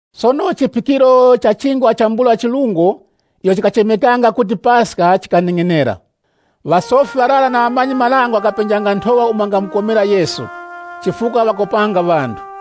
Sono chiphikiro cha Chingwa chambula chirungo icho chikachemekanga kuti Paska chikaneng'enera. Ŵasofi ŵarara na ŵamanyi-marango ŵakapenjanga nthowa umo ŵangakomera Yesu, chifukwa ŵakopanga ŵanthu.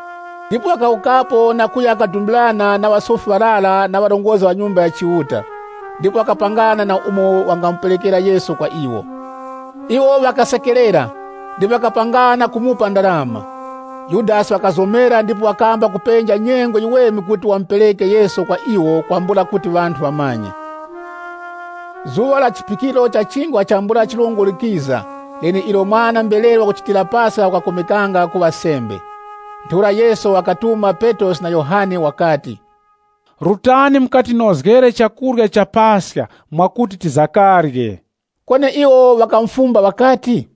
Ndipo wakawukapo na kuya kadumbirana na ŵasofi ŵarara na ŵarongozgi ŵa Nyumba ya Chiuta, ndipo wakapangana nawo umo wangamuperekera Yesu kwa iwo. Iwo ŵakasekerera, ndipo ŵakapangana kumupa ndarama. Yudasi wakazomera ndipo wakamba kupenja nyengo yiweme kuti wamupereke Yesu kwa iwo kwambula kuti ŵanthu ŵamanye. Zuŵa la chiphikiro cha Chingwa chambula chirungo likiza, leneilo mwana-mberere wakuchitira Paska wakakomekanga kuŵa sembe. Ntheura Yesu wakatuma Petrosi na Yohane wakati, “Rutani mukatinozgere chakurya cha Paska mwakuti tizakarye.” Kweni iwo ŵakamufumba ŵakati,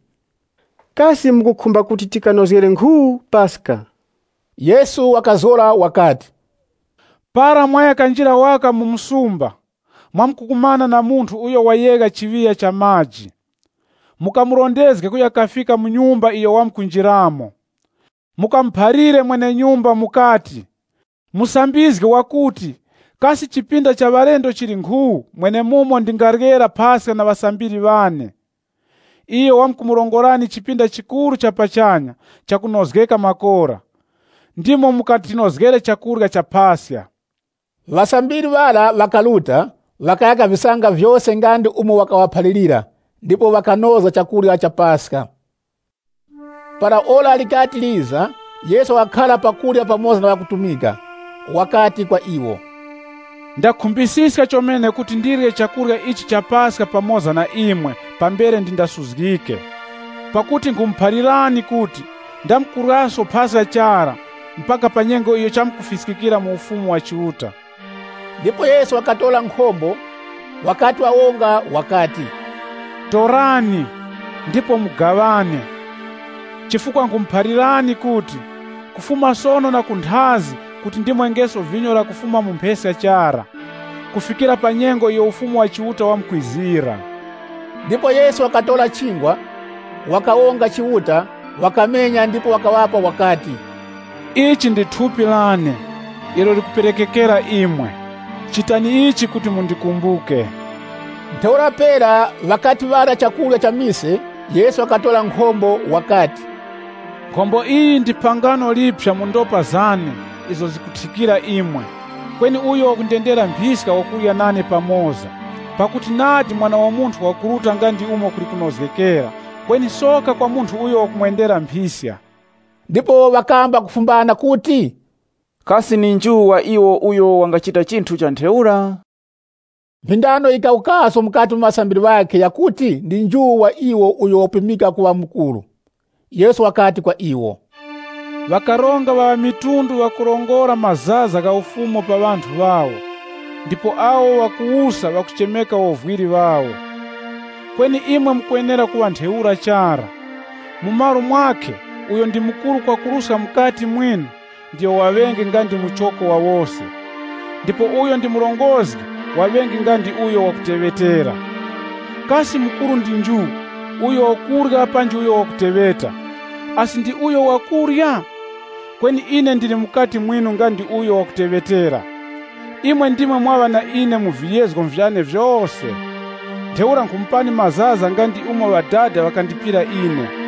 “Kasi mukukhumba kuti tikanozgere nkhu, Paska?” Yesu wakazgora wakati, “Para mwaya kanjira waka mu msumba, mwamkukumana na munthu uyo wayegha chiŵiya cha maji. Mukamurondezge kuya kafika mu nyumba iyo wamkunjiramo. Mukamuphalire mwene-nyumba mukati, ‘Musambizgi wakuti, kasi chipinda cha ŵalendo chili nkhu, mwenemumo ndingaryera Paska na ŵasambiri ŵane?’ Iyo wamkumurongorani chipinda chikuru cha pachanya chakunozgeka makora. Mwenemura ndimo mukatinozgere chakurya cha Paska.” Ŵasambiri ŵara ŵakaruta, ŵakaya kavisanga vyose nga ndi umo wakaŵaphalirira, ndipo ŵakanozga chakurya cha Paska. Para ora likati liza, Yesu wakakhara pa kurya pamoza na ŵakutumika. Wakati kwa iwo, “Ndakhumbisiska chomene kuti ndirye chakurya ichi cha Paska pamoza na imwe pambere ndindasuzgike. Pakuti nkhumuphalirani kuti, ndamkuryaso Paska chara, mpaka pa nyengo iyo chamkufiskira mu Ufumu wa Chiuta.” Ndipo Yesu wakatora nkhombo, wakati wawonga, wakati, “Torani, ndipo mugaŵane. Chifukwa nkhumuphalirani kuti, kufuma sono na kunthazi kuti ndimwengeso vinyo lakufuma mu mpheska chara, kufikira pa nyengo iyo Ufumu wa Chiuta wamkwizira.” Ndipo Yesu wakatora chingwa, wakawonga Chiuta, wakamenya ndipo wakaŵapa wakati, “Ili ndi thupi lane, ilo likuperekekera imwe. Chitani ichi kuti mundikumbuke.” Ntheura pera ŵakati ŵarya chakurya cha mise, Yesu wakatora nkhombo wakati, “Nkhombo iyi ndi phangano liphya mu ndopa zane izo zikuthikira imwe. “Kweni uyo wakundendera mphiska wakurya nane pamoza. Pakuti nadi Mwana wa Munthu wakuruta nga ndi umo kuli kunozgekera, kweni soka kwa munthu uyo wakumwendera mphiska.” Ndipo ŵakamba kufumbana kuti, “Kasi ndi nju wa iwo uyo wangachita chinthu cha ntheura.” Mphindano yikawukaso mukati mu ŵasambiri ŵakhe yakuti ndi nju wa iwo uyo wakupimika kuŵa mukuru. Yesu wakati kwa iwo, Ŵakaronga ŵa ŵamitundu ŵakurongora mazaza gha ufumu pa ŵanthu ŵawo, ndipo awo ŵakuwusa ŵakuchemeka wovwiri ŵawo. Kweni imwe mukwenera kuŵa ntheura chara. Mu malo mwakhe uyo ndi mukuru kwakuruska mukati mwinu, ndiyo waŵenge nga ndi muchoko wa wose, ndipo uyo ndi murongozgi waŵenge nga ndi uyo wakuteŵeta. Kasi mukuru ndi nju, uyo wakurya panji uyo wakuteŵeta? Asi ndi uyo wakurya? Kweni ine ndili mukati mwinu nga ndi uyo wakuteŵetera. “Imwe ndimwe mwaŵa na ine mu viyezgo vyane vyose. Ntheura nkhumupani Ufumu nga ndi umo Ŵadada ŵakandipira ine.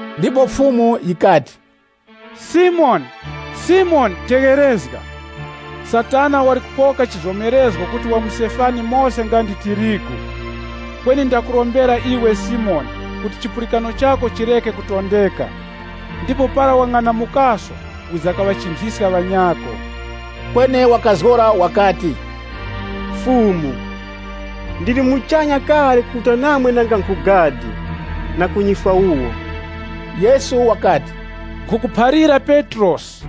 Ndipo Fumu yikati, “Simoni, Simoni, tegherezga! Satana wali kupoka chizomerezgo kuti wamusefani mose nga ndi tirigu. Kweni ndakurombera iwe Simoni kuti chipulikano chako chireke kutondeka. Ndipo para wang'anamukaso, wiza kaŵachinthiskanga ŵanyako.” Kweni wakazgora wakati, “Fumu, ndili muchanya kale kuruta namwe nanga nkhu gadi, na ku nyifwa wuwo.” Yesu wakati, “Nkhukuphalira Petrosi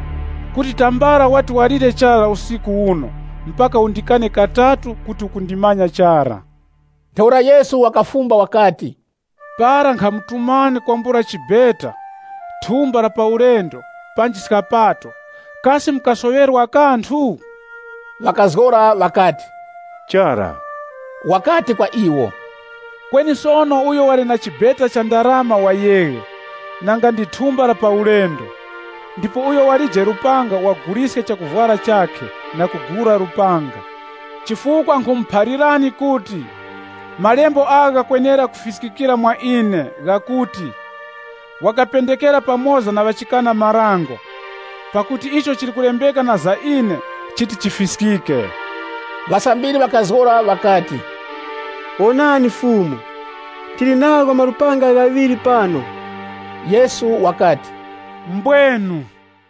kuti pambere tambala wandalire usiku uno uti undikane katatu kuti ukundimanya chara.” Ntheura Yesu wakafumba wakati, “Para nkhamutumani kwambula chibeta, thumba la pa ulendo, panji skapato, kasi mukasoŵerwa kanthu?” Ŵakazgora ŵakati, “Chara.” Wakati kwa iwo, “Kweni sono uyo wali na chibeta cha ndarama wayeghe, nanga ndi thumba la pa ulendo. Ndipo uyo walije lupanga waguliske chakuvwara chakhe, na kugula lupanga. Chifukwa nkhumuphalirani kuti malembo agha ghakwenera kufiskikira mwa ine, ghakuti, ‘Wakapendekera pamoza na ŵakwananga.’ Pakuti icho chili kulembeka na za ine, chikwenera kufiskika.” Ŵasambiri ŵakazgora ŵakati, “Wonani Fumu, tili nagho malupanga ghaŵiri pano.” Yesu wakati, “Mbwenu.”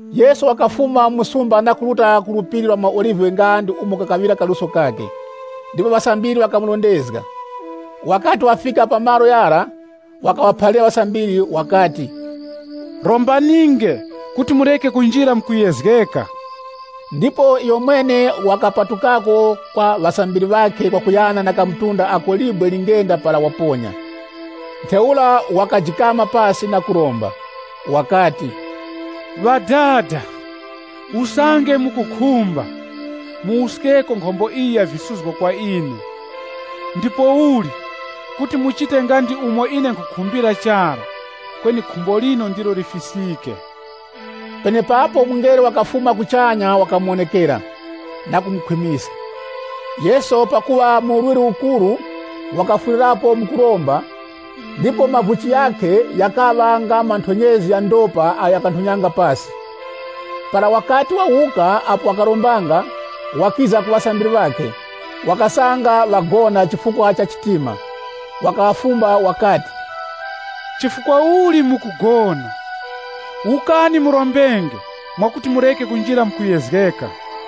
Yesu wakafuma mu msumba na kuruta ku Phiri la maOlive nga ndi umo kakaŵira kaluso kakhe. Ndipo ŵasambiri ŵakamurondezga. Wakati wafika pa malo ghara, wakaŵaphalira ŵasambiri wakati, “Rombaninge kuti mureke kunjira mu kuyezgeka.” Ndipo iyomwene wakapatukako kwa ŵasambiri ŵakhe kwakuyana na kamtunda ako libwe lingenda para waponya. Ntheura wakajikama pasi na kuromba. Wakati, “Ŵadada, usange mukukhumba, muwuskeko nkhombo iyi ya visuzgo kwa ine. Ndipouli, kuti muchite nga ndi umo ine nkhukhumbira chara, kweni khumbo linu ndilo lifiskike.” [ Penepapo mungelo wakufuma kuchanya wakamuwonekera, na kumukhwimiska. Yesu pakuŵa mu urwirwi ukuru, wakafwirirapo mu kuromba ndipo mavuchi ghakhe ghakaŵa nga manthonyezi gha ndopa agho ghakanthonyanga pasi.] Para wakati wawuka apo wakarombanga, wakiza ku ŵasambiri ŵakhe, wakasanga ŵagona chifukwa cha chitima. Wakaŵafumba wakati, “Chifukwa uli mukugona? Wukani murombenge, mwakuti mureke kunjira mu kuyezgeka.”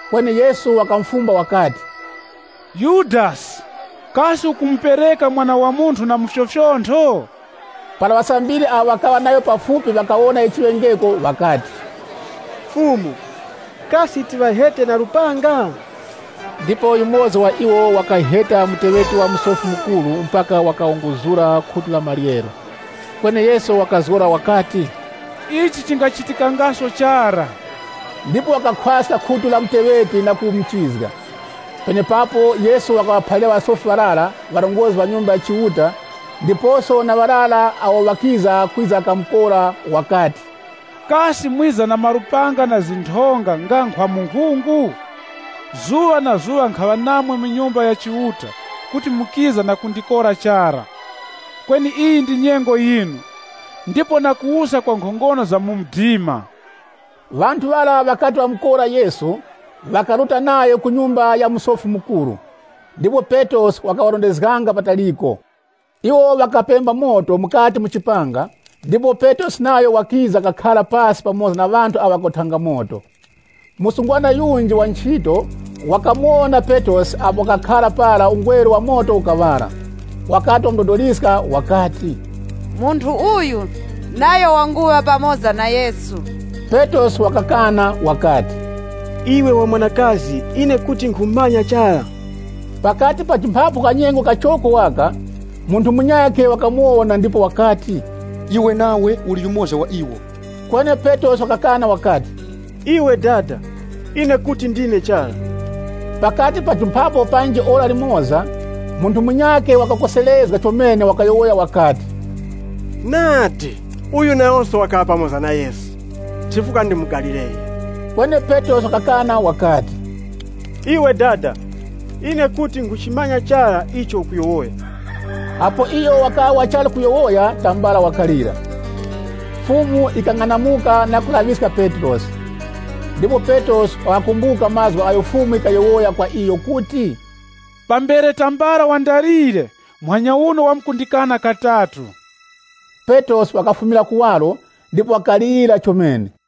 Kweni Yesu wakamufumba wakati, “Yudasi, kasi ukumupereka Mwana wa Munthu na mufyofyontho?” Para ŵasambiri awo ŵakaŵa nayo pafupi ŵakawona icho chiŵengeko ŵakati, “Fumu, kasi tiŵahete na lupanga?” Ndipo yumoza wa iwo wakaheta muteŵeti wa Musofi Mukuru mpaka wakawunguzura khutu la maryero. Kweni Yesu wakazgora wakati, “Ichi chingachitikangaso chara!” Ndipo wakakhwaska khutu la muteŵeti na kumuchizga. Penepapo Yesu wakaŵaphalira ŵasofi ŵarara, ŵarongozgi ŵa Nyumba ya Chiuta, ndiposo na ŵarara awo ŵakiza kwiza kamukora wakati, “Kasi mwiza na malupanga na zinthonga nga nkhwa munkhungu? Zuŵa na zuŵa nkhaŵa namwe mu Nyumba ya Chiuta kuti mukiza na kundikora chara. Kweni iyi ndi nyengo yinu, ndipo na kuwusa kwa nkhongono za mu mdima.” Ŵanthu ŵara ŵakati ŵamukora Yesu, ŵakaruta nayo ku nyumba ya Musofi Mukuru. Ndipo Petrosi wakaŵarondezganga pataliko. Iwo ŵakapemba moto mukati mu chipanga ndipo Petrosi nayo wakiza kakhara pasi pamoza na ŵanthu awo ŵakawothanga moto. Msungwana yunji wa nchito, wakati wakamuwona Petrosi apo wakakhara mu ungweru wa moto, wamudodoliska ndipo wakati, “Munthu uyu nayo wanguŵa pamoza na Yesu.” Petrosi wakakana wakati, “Iwe wa mwanakazi ine kuti nkhumumanya chara.” Pakati pajumphapo kanyengo kachoko waka, munthu munyakhe wakamuwona ndipo wakati, “Iwe nawe uli yumoza wa iwo.” Kweni Petrosi wakakana wakati, “Iwe dada, ine kuti ndine chara.” Pakati pajumphapo panji ora limoza, munthu munyakhe wakakoserezga chomene wakayowoya wakati, “Nadi uyu nayoso wakaŵa pamoza na Yesu, chifukwa ndi mu Galileya.” Kweni Petrosi wakakana wakati, “Iwe dada, ine kuti nkhuchimanya chara icho ukuyowoya.” Apo iyo wakaŵa wachali kuyowoya, tambala wakalira. Fumu yikang'anamuka na kulaŵiska Petrosi. Ndipo Petrosi wakakumbuka mazgu agho Fumu yikayowoya kwa iyo kuti, “Pambere tambala wandalire, muhanya uno wamkundikana katatu.” Petrosi wakafumira kuwaro ndipo wakalira chomene.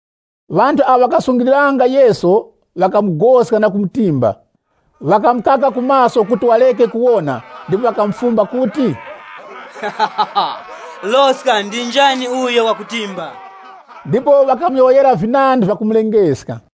Ŵanthu awo ŵakasungiliranga Yesu ŵakamugoska na kumutimba. Ŵakamukaka ku maso kuti wareke kuwona na kumufumba kuti, “Loska! Ndi njani uyo wakutimba?” Ndipo ŵakamuyowoyera vinandi vyakumulengeska.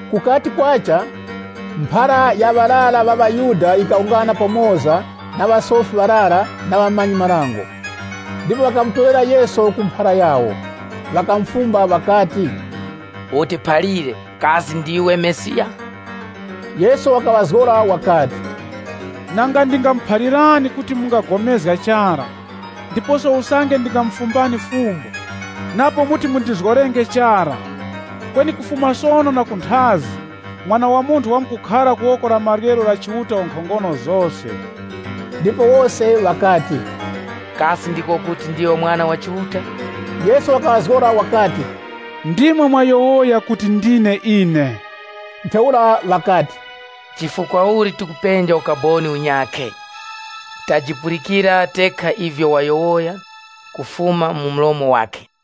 Kukati kwacha, mphara ya ŵarara ŵa ŵaYuda yikawungana pamoza na ŵasofi ŵarara na ŵamanyi-marango. Ndipo ŵakamutorera Yesu ku mphara yawo. Ŵakamufumba ŵakati, “Utiphalire, kasi ndiwe Mesiya?” Yesu wakaŵazgora wakati, “Nanga ndingamuphalirani, imwe kuti mungapulikana chara, ndiposo usange ndingamufumbani fumbo, napo muti mundizgorenge chara. Kweni kufuma sono na kunthazi, Mwana wa Munthu wamkukhara ku woko la maryero la Chiuta, Mwenenkhongono zose.” Ndipo wose ŵakati, “Kasi ndiko kuti ndiwe Mwana wa Chiuta?” Yesu wakaŵazgora wakati, “Ndimwe mwayowoya kuti ndine ine.” Ntheura ŵakati, “Chifukwa uli tikupenja ukaboni unyakhe? Tajipulikira tekha ivyo wayowoya kufuma mu mlomo wakhe.”